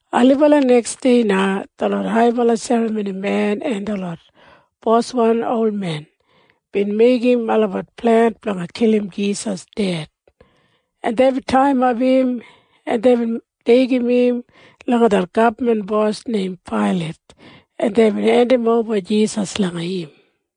Ailibala neksdei na detlot haibala serramonimen en detlot boswan olmen bin meigim olabat plen blanga kilim Jisas ded, en deibin taiyimap im, en deibin deigim im langa det gabman bos neim Pailat, en deibin hendimoba Jisas langa im.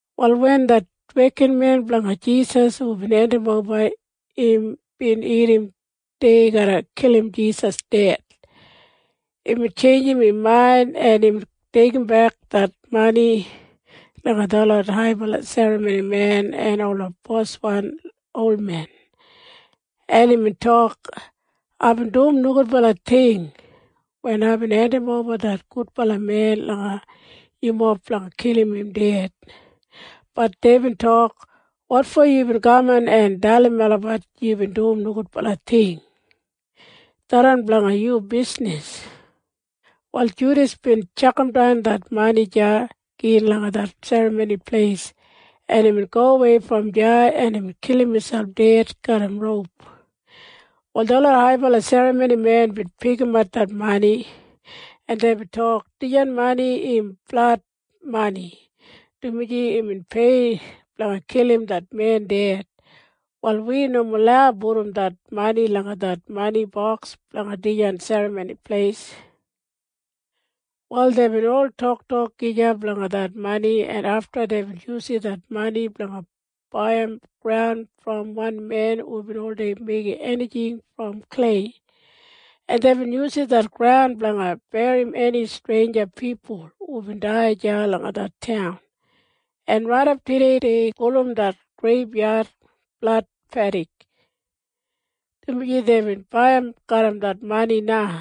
Wal wen det wekinmen blanga Jisas hubin hendimoba im bin irrim dei garra kilim Jisas ded, imbin tjeinjim im main, en imbin deigimbek det mani langa detlot haibala serramonimen en ola boswan olmen, en imbin tok, “Aibin dum nogudbala ting wen aibin hendimoba det gudbala men langa yumob blanga kilim im ded.” Bat deibin tok, “Wotfo yubin kaman en dalim melabat yubin dum nogudbala ting? Tharran blanga yu bisnis.” Wal Judas bin tjakamdan det mani deya gin langa det Serramoni Pleis, en imbin gowei brom deya, en imbin kilim miselp ded garram roup. Wal detlot haibala serramonimen bin pikimap det mani, en deibin tok, “Dijan mani im blad mani, dumaji imbin pei blanga kilim det men ded. Wal wi nomo lau pudum det mani langa det mani boks blanga dijan Serramoni Pleis.” Wal deibin ol toktok gija blanga det mani, en afta deibin yusum det mani blanga baiyim graun brom wan men hubin oldei meigim enijing brom klei, en deibin yusum det graun blanga berrim eni streinja pipul hubin dai deya langa det taun. En raidap tudei dei gulum det greibyad Blad Pedik, dumaji deibin baiyim garram det mani na.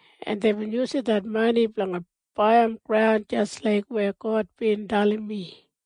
en deibin yusum det mani blanga baiyim graun jis laik weya God bin dalim mi.”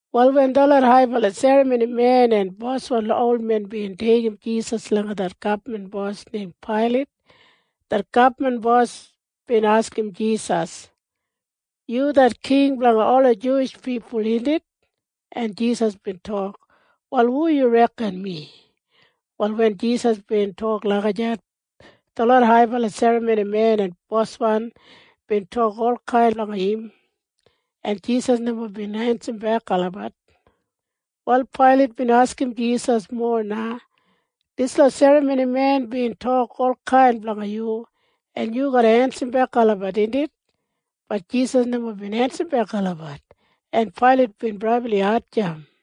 Wal wen detlot haibala serramonimen en boswan olmen bin deigim Jisas langa det gabman bos neim Pailat, det gabman bos bin askim Jisas, “Yu det king blanga ola Juwish pipul, indit?” En Jisas bin tok, “Wal hu yu reken mi?” Wal wen Jisas bin tok lagijat, detlot haibala serramonimen en boswan bin tok olkain blanga im, en Jisas nomo bin ensimbek olabat. Wal Pailat bin askim Jisas mowa na, “Dislot serramonimen bin tok olkain blanga yu. Yu garra ensimbek olabat, indit?” Bat Jisas nomo bin ensimbek olabat, en Pailat bin brabli hatjamp.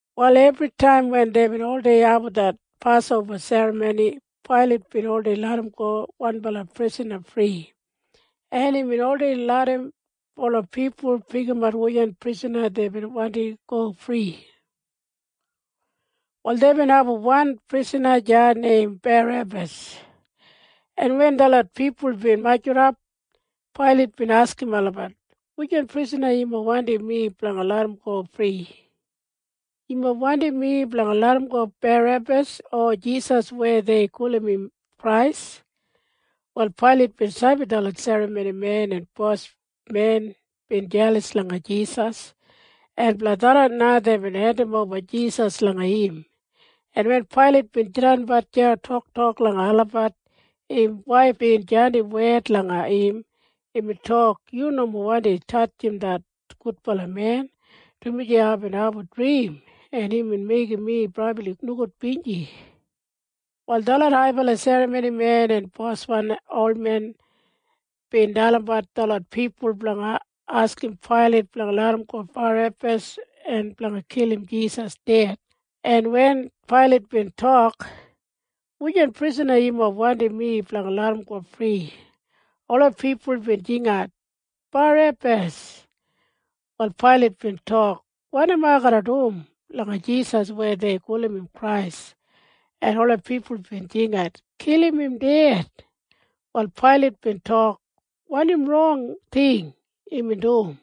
Wal ebritaim wen deibin oldei abum det Pasoba Serramoni, Pailat bin oldei larramgo wanbala prisana fri, en imbin oldei larram ola pipul pikimat wujan prisana deibin wandim go fri. Wal deibin abum wan prisana deya neim Barebas, en wen detlot pipul bin majurrap, Pailat bin askim olabat, “Wujan prisana yumob wandim mi blanga larramgo fri? Yumob wandim mi blanga larramgo Barebas o Jisas weya dei gulum im Krais?” Wal Pailat bin sabi detlot serramonimen en bosmen bin jelas langa Jisas, en blanga tharran na deibin hendimoba Jisas langa im, en wen Pailat bin jidanbat deya toktok langa olabat, im waif bin jandim wed langa im. Imbin tok, “Yu nomo wandi tatjim det gudbala men, dumaji aibin abum drim en imbin meigim mi brabli nogudbinji.” Wal detlot haibala serramonimen en boswan olmen bin dalimbat detlot pipul blanga askim Pailat blanga larramgo Barebas en blanga kilim Jisas ded, en wen Pailat bin tok, “Wujan prisana yumob wandim mi blanga larramgo fri?” Ola pipul bin jingat, “Barebas!” Wal Pailat bin tok, “Wanim ai garra dum langa Jisas weya dei gulum im Krais?” En ola pipul bin jingat, “Kilim im ded!” Wal Pailat bin tok, “Wanim rong ting imbin dum?”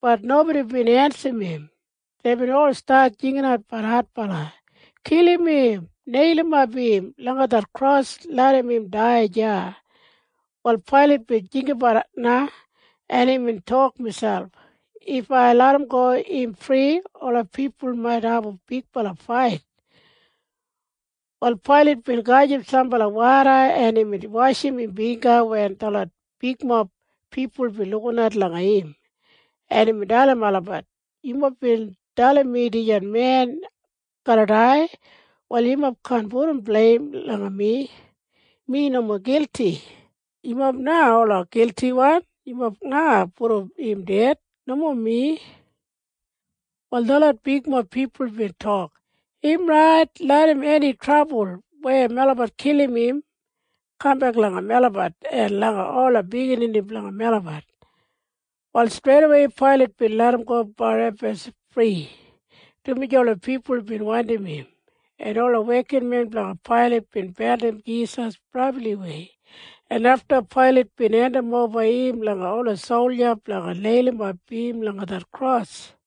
Bat nobodi bin ensim im. Deibin ol stat jinginatbat adbala, “Kilim im! Neilimap im langa kros en larram im dai deya!” Wal Pailat bin jinggabat na, en imbin tok miselp, “If ai larramgo im fri, ola pipul mait abum bigbala fait.” Wal Pailat bin gajim sambala woda, en imbin washim im bingga wen detlot bigmob pipul bin lukinat langa im, en imbin dalim olabat, “Yumob bin dalim mi dijan men garra dai. Wal yumob kaan pudum bleim langa mi. Mi nomo gilti. Yumob na ola giltiwan. Yumob na pudum im ded, nomo mi.” Wal detlot bigmob pipul bin tok, “Im rait. Larram eni trabul weya melabat kilim im kambek langa melabat en langa ola biginini blanga melabat.” Wal streidawei Pailat bin larramgo Barebas fri, dumaji ola pipul bin wandim im, en ola wekinmen blanga Pailat bin beldim Jisas brabliwei, en afta Pailat bin hendimoba im langa ola solja blanga neilimap im langa det kros.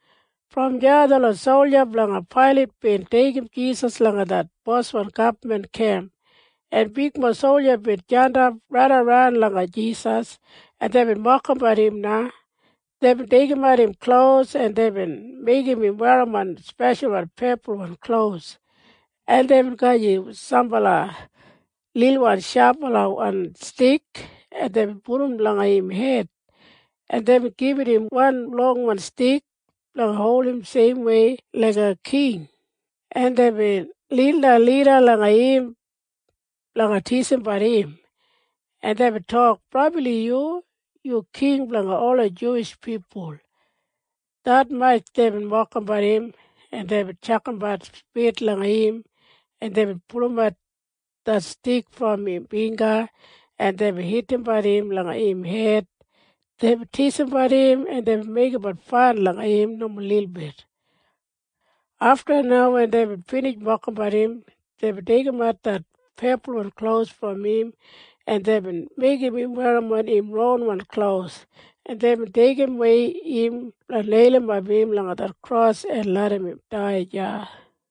Brom deya detlot solja blanga Pailat bin deigim Jisas langa det boswan gabman kemp, en bigmob solja bin jandap raidaran langa Jisas, en deibin mokimbat im na. Deibin deigimat im klos, en deibin meigim im werrimon speshalwan pepulwan klos, en deibin gajim sambala lilwan shabalawan stik, en deibin pudum langa im hed, en deibin gibit im wan longwan stik blanga holdim seimwei laiga king, en deibin nildan lida langa im blanga tisimbat im, en deibin tok, “Brabli yu! Yu king blanga ola Juwish pipul!” Detmatj deibin mokimbat im, en deibin tjakambat spit langa im, en deibin pulumat det stik brom im bingga, en deibin hitimbat im langa im hed. Deibin tisimbat im en meigimbat fan langa im nomo lilbit. Afta na wen deibin binij mokimbat im, deibin deigimat det pepulwan klos brom im, en deibin meigim im werrimon im ronwan klos, en deibin deigimwei im blanga neilimap im langa det kros en larram im dai deya.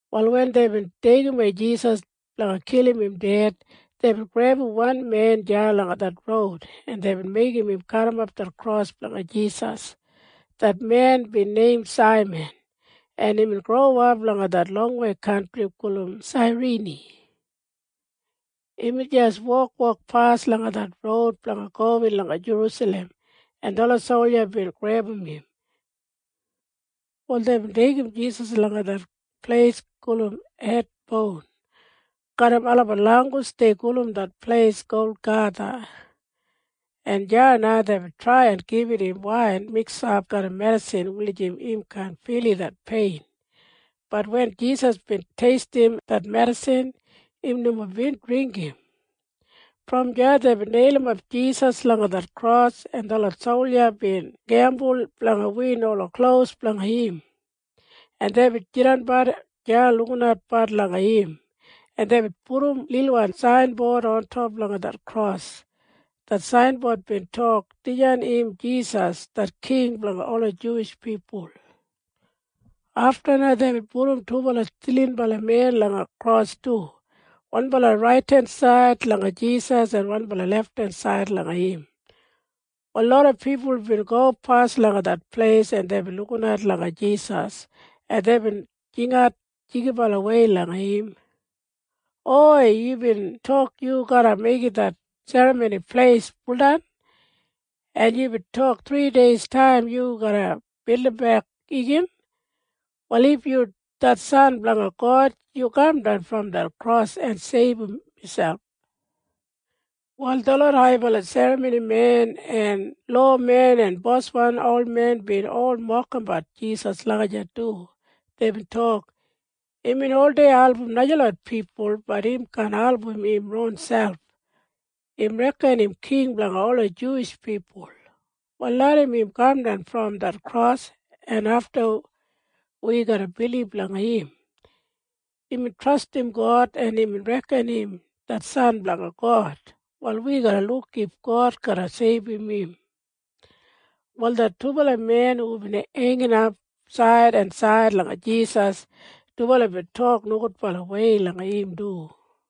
Wal wen deibin deigimwei Jisas blanga kilim im ded, deibin grebum wan men deya langa det roud, en deibin meigim im garrimap det kros blanga Jisas. Det men bin neim Saiman, en imbin growap langa det longwei kantri gulum Sairini. Imbin jis wokwokpas langa det roud blanga gowin langa Jerusalem, en detlot solja bin grebum im. Wal deibin deigim Jisas langa det pleis gulum Hed Boun. Garram olabat langgus dei gulum det pleis Golgatha, en deya na deibin trai en gibit im wain miksap garram medisin wulijim im kaan filim det pein. Bat wen Jisas bin teistim det medisin, im nomo bin dringgim. Brom deya deibin neilimap Jisas langa det kros, en detlot solja bin gembul blanga win ola klos blanga im, en deibin jidanbat deya lukinatbat langa im, en deibin pudum lilwan sainbod ontop langa det kros. Det sainbod bin tok, “Dijan im Jisas det king blanga ola Juwish pipul.” Afta na deibin pudum dubala stilinbala men langa kros du, wanbala raidensaid langa Jisas en wanbala lefthensaid langa im. Wal loda pipul bin gopas langa det pleis, en deibin lukinat langa Jisas, en deibin jingat jigibalawei langa im, “Hoi! Yubin tok yu garra meigim det Serramoni Pleis buldan, en yubin tok thrideistaim yu garra bildimbek igin. Wal if yu det San blanga God, yu kamdan brom det kros en seibum miselp!” Wal detlot haibala serramonimen en lowamen en boswan olmen bin ol mokimbat Jisas lagijat du. Deibin tok, “Imbin oldei album najalot pipul. Bat im kaan album im ronselp. Im reken im king blanga ola Juwish pipul. Wal larram im kamdan brom det kros, en afta wi garra bilib langa im. Imbin trastim God, en imbin reken im det San blanga God. Wal wi garra luk if God garra seibum im.” Wal det dubala men hubin heinginap said en said langa Jisas, dubala bin tok nogudbalawei langa im du.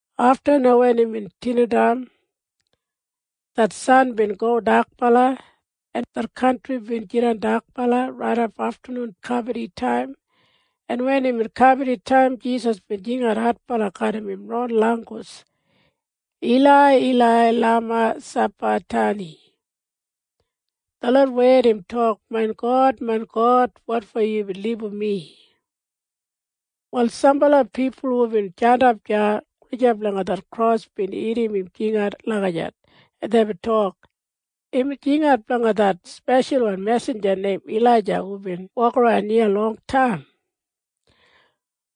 Afta na wen imbin dinataim, det san bin go dakbala, en det kantri bin jidan dakbala raidap aftanun kabaditaim, en wen imbin kabaditaim, Jisas bin jingat adbala garram im ron langgus, “Ilai, Ilai, lama sabaktani?” Detlot wed im tok, “Main God, main God, wotfo yubin libum mi?” Wal sambala pipul hubin jandap deya gulijap langa det kros bin irrim im jingat lagijat, en deibin tok, “Im jingat blanga det speshalwan mesinja neim Ilaija hubin wokaran iya longtaim.”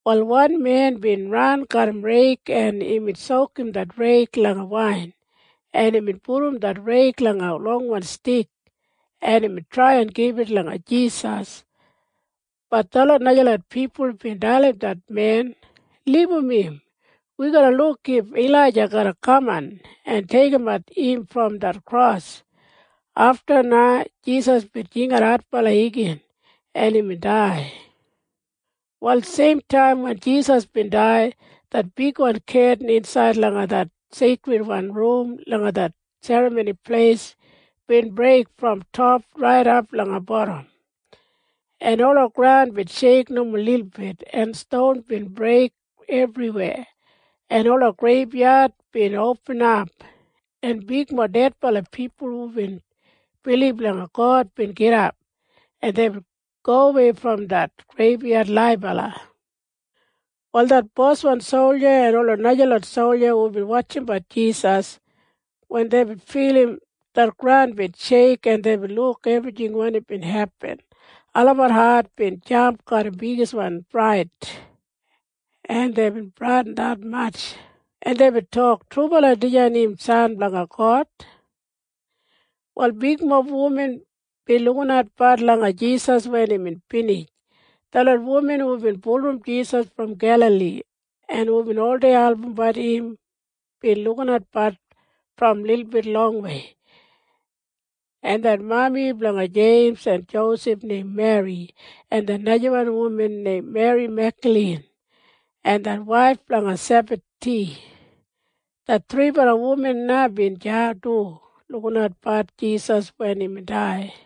Wal wan men bin ran garram reig, en imbin sokum det reig langa wain, en imbin pudum det reig langa longwan stik, en imbin trai en gibit langa Jisas. Bat detlot najalot pipul bin dalim det men, “Libum im! Wi garra luk if Ilaija garra kaman en deigimat im brom det kros!” Afta na Jisas bin jingat adbala igin, en imbin dai. Wal seimtaim wen Jisas bin dai, det bigwan ketin insaid langa det seikridwan rum langa det Serramoni Pleis bin breik brom top raidap langa bodam, en ola graun bin sheik nomo lilbit, en ston bin breik ebriweya, en ola greibyad bin opinap, en bigmob dedbala pipul hubin bilib langa God bin gidap, en deibin gowei brom det greibyad laibala. Wal det boswan solja en ola najalot solja hubin wotjimbat Jisas, wen deibin filim det graun bin sheik, en deibin luk ebrijing wanim bin hepin, olabat hat bin jamp garram bigiswan frait, en deibin bradin detmatj, en deibin tok, “Trubala dijan im San blanga God!” Wal bigmob wuman bin lukinatbat langa Jisas wen imbin binij. Detlot wuman hubin bulurrum Jisas brom Gelali en hubin oldei albumbat im bin lukinatbat brom lilbit longwei. En det mami blanga Jeims en Josef neim Meri, en det najawan wuman neim Meri Megdalin, en det waif blanga Sebadi, det thribala wuman na bin deya du lukinatbat Jisas wen imbin dai.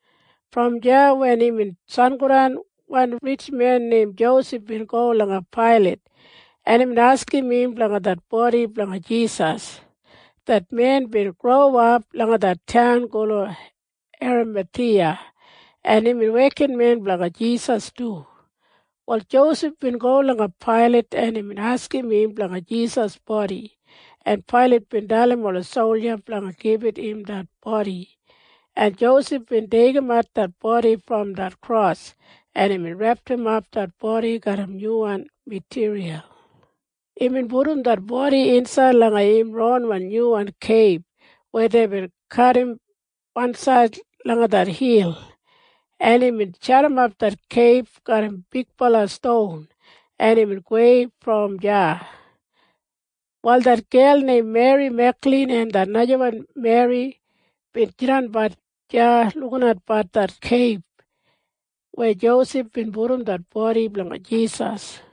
Brom deya wen imbin sangodan, wan ritjmen neim Josef bin go langa Pailat, en imbin askim im blanga det bodi blanga Jisas. Det men bin growap langa det taun gulum Eramathiya, en imbin wekinmen blanga Jisas du. Wal Josef bin go langa Pailat, en imbin askim im blanga Jisas bodi, en Pailat bin dalim ola solja blanga gibit im det bodi, en Josef bin deigimat det bodi brom det kros, en imbin repdimap det bodi garram nyuwan matiriyal, en imbin pudum det bodi insaid langa im ron nyuwan keib weya deibin kadim wansaid langa det hil, en imbin jadimap det keib garram bigbala ston, en imbin gowei brom deya. Wal det gel neim Meri Megdalin en det najawan Meri bin jidanbat deya lukinatbat det keib weya Josef bin pudum det bodi blanga Jisas.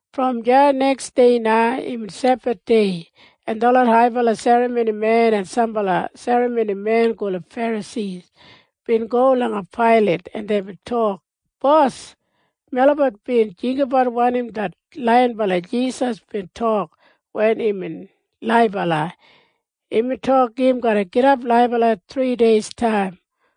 Brom deya neksdei na imbin Sebathdei, en detlot haibala serramonimen en sambala serramonimen gulum Ferasi bin go langa Pailat, en deibin tok, “Bos, melabat bin jinggabat wanim det laiyinbala Jisas bin tok wen imbin laibala. Imbin tok im garra gidap laibala thrideistaim.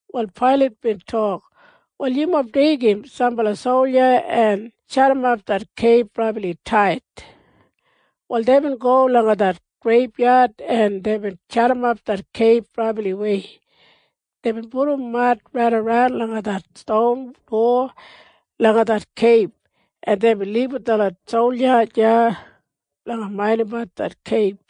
Wal Pailat bin tok, “Wal yumob deigim sambala solja en jadimap det keib brabli tait.” Wal deibin go langa det greibyad en deibin jadimap det keib brabliwei. Deibin pudum mad raidaran langa det ston dowa langa det keib, en deibin libum detlot solja deya blanga maindimbat det keib.